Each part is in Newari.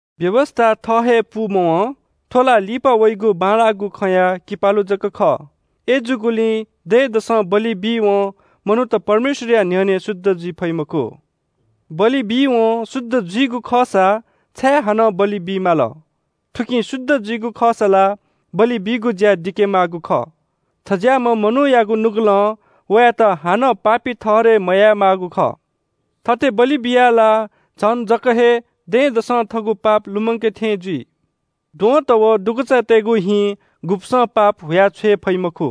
व्‍यवस्‍था थः हे पूमवं, थ्‍व ला लिपा वइगु बांलाःगु खँया किपालु जक खः। अय्‌जूगुलिं दँय्‌दसं बलि बीवं मनूत परमेश्‍वरया न्‍ह्यःने शुद्ध जुइ फइ मखु। बलि बीवं शुद्ध जुइगु खःसा छाय् हानं बलि बी माल? थुकिं शुद्ध जुइगु खःसा ला बलि बीगु ज्‍या दिके माःगु खः। थज्‍याःम्‍ह मनूयागु नुगलं वयात हानं पापी ठहरय् मयायेमाःगु खः। थथे बलि बियाः ला झन जक हे दँय्‌दसं थःगु पाप लुमंके थें जुइ। द्वहंत व दुगुचातय्‌गु हिं गुब्‍सं पाप हुयाछ्वये फइ मखु।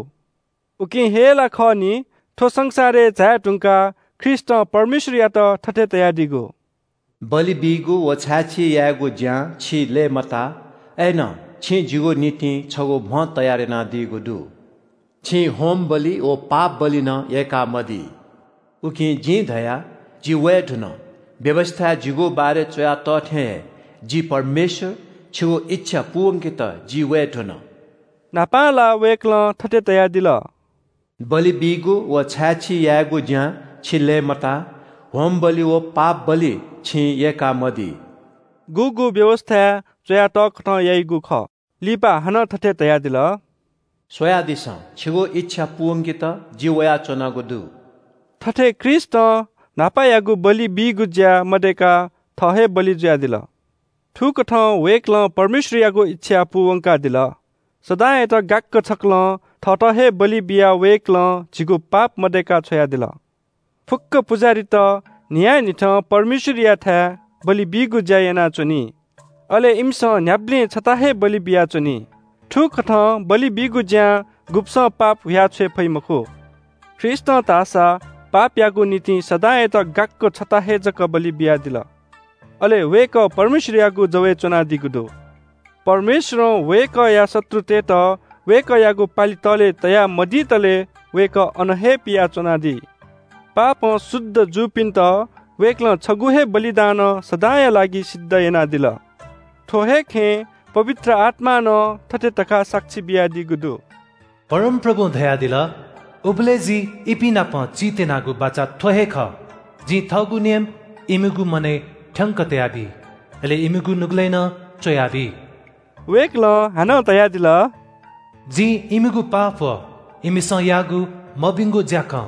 उकिं हे ला खः नि, थ्‍व संसारय् झाये धुंकाः ख्रीष्‍टं परमेश्‍वरयात थथे धयादीगु – “बलि बीगु व छाय्‌छी यायेगु ज्‍यां छि लय्‌मताः अय्‌नं छिं जिगु निंतिं छगू म्‍ह तयार यानादीगु दु। छिं होमबलि व शुद्ध जुइगु बलि नं यय्‌कामदी। उकिं जिं धया – ‘जि वये धुन, व्‍यवस्‍थाय् जिगु बारे च्‍वया तः थें हे, जि परमेश्‍वर! छिगु इच्‍छा पूवंकेत जि वये धुन।’” न्‍हापां ला वय्‌कलं थथे धयादिल – “बलि बीगु व छाय्‌छी यायेगु ज्‍यां छि लय्‌मता। होमबलि व शुद्ध जुइगु बलि छिं यय्‌कामदी।” (गुगु व्‍यवस्‍थाय् च्‍वया तःकथं याइगु खः) लिपा हानं थथे धयादिल – “स्‍वयादिसँ, छिगु इच्‍छा पूवंकेत जि वयाच्‍वनागु दु।” थथे ख्रीष्‍टं न्‍हापायागु बलि बीगु ज्‍या मदय्‌काः थः हे बलि जुयादिल। थुकथं वय्‌कलं परमेश्‍वरयागु इच्‍छा पूवंकादिल। सदांयात गाक्‍क छकलं थःत हे बलि बियाः वय्‌कलं झीगु पाप मदय्‌का छ्वयादिल। फुक्‍क पुजाहारीत न्‍हियान्‍हिथं परमेश्‍वरयाथाय् बलि बीगु ज्‍या यानाच्‍वनी। अले इमिसं न्‍ह्याबलें छता हे बलि बियाच्‍वनी। थुकथं बलि बीगु ज्‍यां गुब्‍सं पाप हुयाछ्वये फइ मखु। ख्रीष्‍टं धाःसा पापयागु निंतिं सदांयात गाक्‍क छता हे जक बलि बियादिल। अले वय्‌कः परमेश्‍वरयागु जवय् च्‍वनादीगु दु। परमेश्‍वरं वय्‌कःया शत्रुतय्‌त वय्‌कःयागु पालि तःले तया मदितले वय्‌कः अन हे पिया च्‍वनादी। पापं शुद्ध जूपिन्‍त वय्‌कलं छगू हे बलिदानं सदांया लागि सिद्ध यानादिल। थ्‍व हे खँय् पवित्र आत्‍मां नं थथे धकाः साक्षी बियादीगु दु – “परमप्रभुं धयादिल – उबलय् जिं इपिं नाप चीत्‍यनागु बाचा थ्‍व हे खः – जिं थःगु नियम इमिगु मनय् थ्‍यंक तयाबी, अले इमिगु नुगलय् नं च्‍वयाबी।” वय्‌कलं हानं धयादिल – “जिं इमिगु पाप व इमिसं याःगु मभिंगु ज्‍याखँ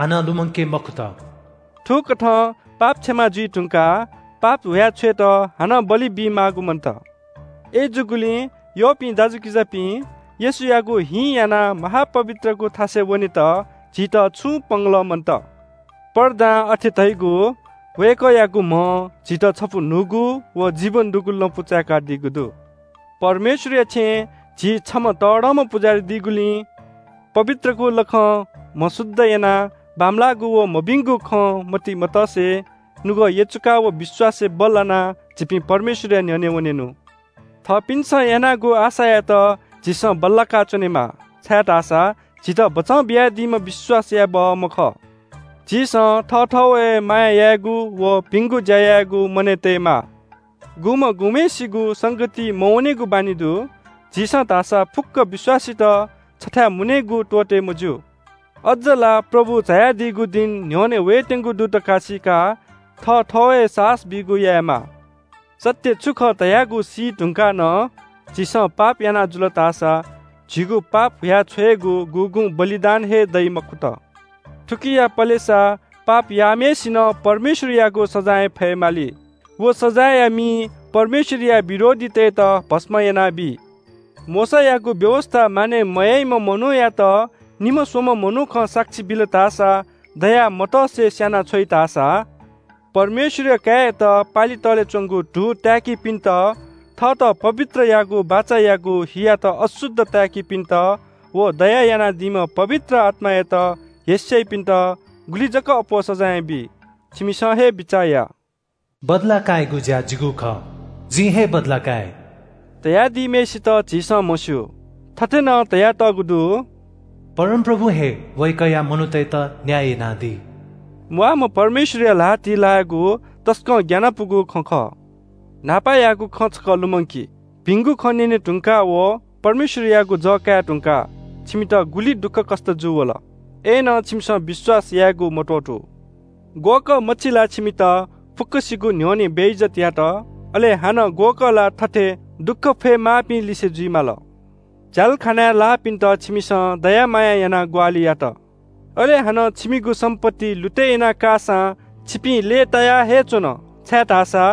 हानं लुमंके मखुत।” थुकथं पाप क्षमा जुइ धुंकाः पाप हुया छ्वयेत हानं बलि बीमाःगु मन्‍त। अय्‌जूगुलिं यःपिं दाजुकिजापिं, येशूयागु हिं यानाः महा-पवित्रगु थासय् वनेत झीत छुं पंगलः मन्‍त। पर्दां अथे धइगु वय्‌कःयागु म्‍हं झीत छपु न्‍हूगु व जीवन दुगु लँपु चाय्‌कादीगु दु। परमेश्‍वरया छेँय् झी छम्‍ह तःधंम्‍ह पुजाहारी दीगुलिं पवित्रगु लखं म्‍ह शुद्ध यानाः बांमलाःगु व मभिंगु खँ मतिइ मतसे, नुगः यचुकाः व विश्‍वासय् बल्‍लानाः झीपिं परमेश्‍वरया न्‍ह्यःने वनेनु। थःपिन्‍सं यानागु आशायात झीसं बल्‍लाका च्‍वनेमाः, छाय्‌धाःसा झीत बचं बियादीम्‍ह विश्‍वास याये बहःम्‍ह खः। झीसं थःथवय् माया यायेगु व भिंगु ज्‍या यायेगु मनय् तयेमाः। गुम्‍हं गुम्‍हय्‌सिगु संगतिइ मवनेगु बानी दइ, झीपिं धाःसा छथाय् मुनेगु त्‍वःते मज्‍यू। अज्‍ज ला प्रभु झायादीगु दिं न्‍ह्यःने वयेत्‍यंगु दु धकाः सीकाः थःथवय् साहस बीगु यायेमाः। सत्‍य छु खः धयागु सीधुंकाः नं झीसं पाप याना जुल धाःसा झीगु पाप हुयाछ्वयेगु गुगुं बलिदान हे दइ मखुत। थुकिया पलेसा पाप याःम्‍हय्‌सिनं परमेश्‍वरयागु सजाँय फयेमाली। व सजाँयया मिं परमेश्‍वरया विरोधीतय्‌त भस्‍म यानाबी। मोशायागु व्‍यवस्‍था मानय् मयाइम्‍ह मनूयात निम्‍ह स्‍वम्‍ह मनुखं साक्षी बिल धाःसा दया मतसे स्‍यानाछ्वइ धाःसा परमेश्‍वरया काय्‌यात पालि तःले च्‍वंगु धू ताय्‌कीपिन्‍त, थःत पवित्र याःगु बाचायागु हियात अशुद्ध ताय्‌कीपिन्‍त व दया यानादीम्‍ह पवित्र आत्‍मायात हेस्‍याइपिन्‍त गुलि जक अप्‍वः सजाँय बी। छिमिसं हे बिचाः या। “बदला कायेगु ज्‍या जिगु खः, जिं हे बदला काये,” धयादीम्‍हय्‌सित झीसं म्‍हस्‍यू। थथे नं धयातःगु दु – “परमप्रभुं हे वय्‌कःया मनूतय्‌त न्‍याय यानादी।” म्‍वाःम्‍ह परमेश्‍वरया ल्‍हातिइ लायेगु तसकं ग्‍यानापुगु खँ खः। न्‍हापायागु खँ छकः लुमंकि – भिंगु खँ न्‍यने धुंकाः व परमेश्‍वरयागु जः काये धुंकाः छिमित गुलि दुःखकष्‍ट जूवल। अय्‌नं छिमिसं विश्‍वास यायेगु मत्‍वःतू। ग्‍वःकःमछि ला छिमित फुक्‍कसिगु न्‍ह्यःने बेइज्‍जत यात, अले हानं ग्‍वःकः ला थथे दुःख फये माःपिं लिसे जुइ माल। झ्‍यालखानाय् लाःपिन्‍त छिमिसं दयामाया यानाः ग्‍वाहालि यात, अले हानं छिमिगु सम्‍पत्ति लुतय् यानाकाःसां छिपिं लय्‌ताया हे च्‍वन, छाय्‌धाःसा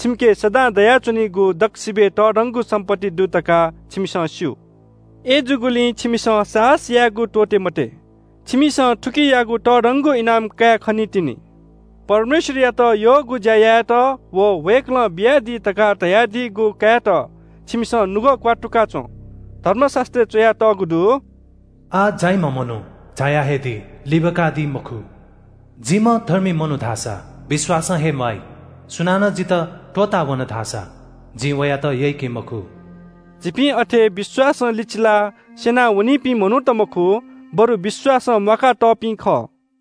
छिमिके सदां दयाच्‍वनीगु दक्‍वसिबय् तःधंगु सम्‍पत्ति दु धकाः छिमिसं स्‍यू। अय्‌जूगुलिं छिमिसं साहस यायेगु त्‍वःते मते। छिमिसं थुकियागु तःधंगु इनाम काये खनीतिनि। परमेश्‍वरयात यःगु ज्‍या यायेत व वय्‌कलं बियादी धकाः धयादीगु कायेत छिमिसं नुगः क्‍वात्तुका च्‍वँ। धर्मशास्‍त्रय् च्‍वयातःगु दु – “आः झाइम्‍ह मनू झाया हे दी, लिबाकादी मखु। जिम्‍ह धर्मी मनू धाःसा विश्‍वासं हे म्‍वाइ। सुनानं जितः त्‍वःतावन धाःसा जिं वयात यय्‌के मखु।” झीपिं अथे विश्‍वासं लिचिलाः स्‍यना वनीपिं मनूत मखु, बरु विश्‍वासं म्‍वाका तःपिं खः।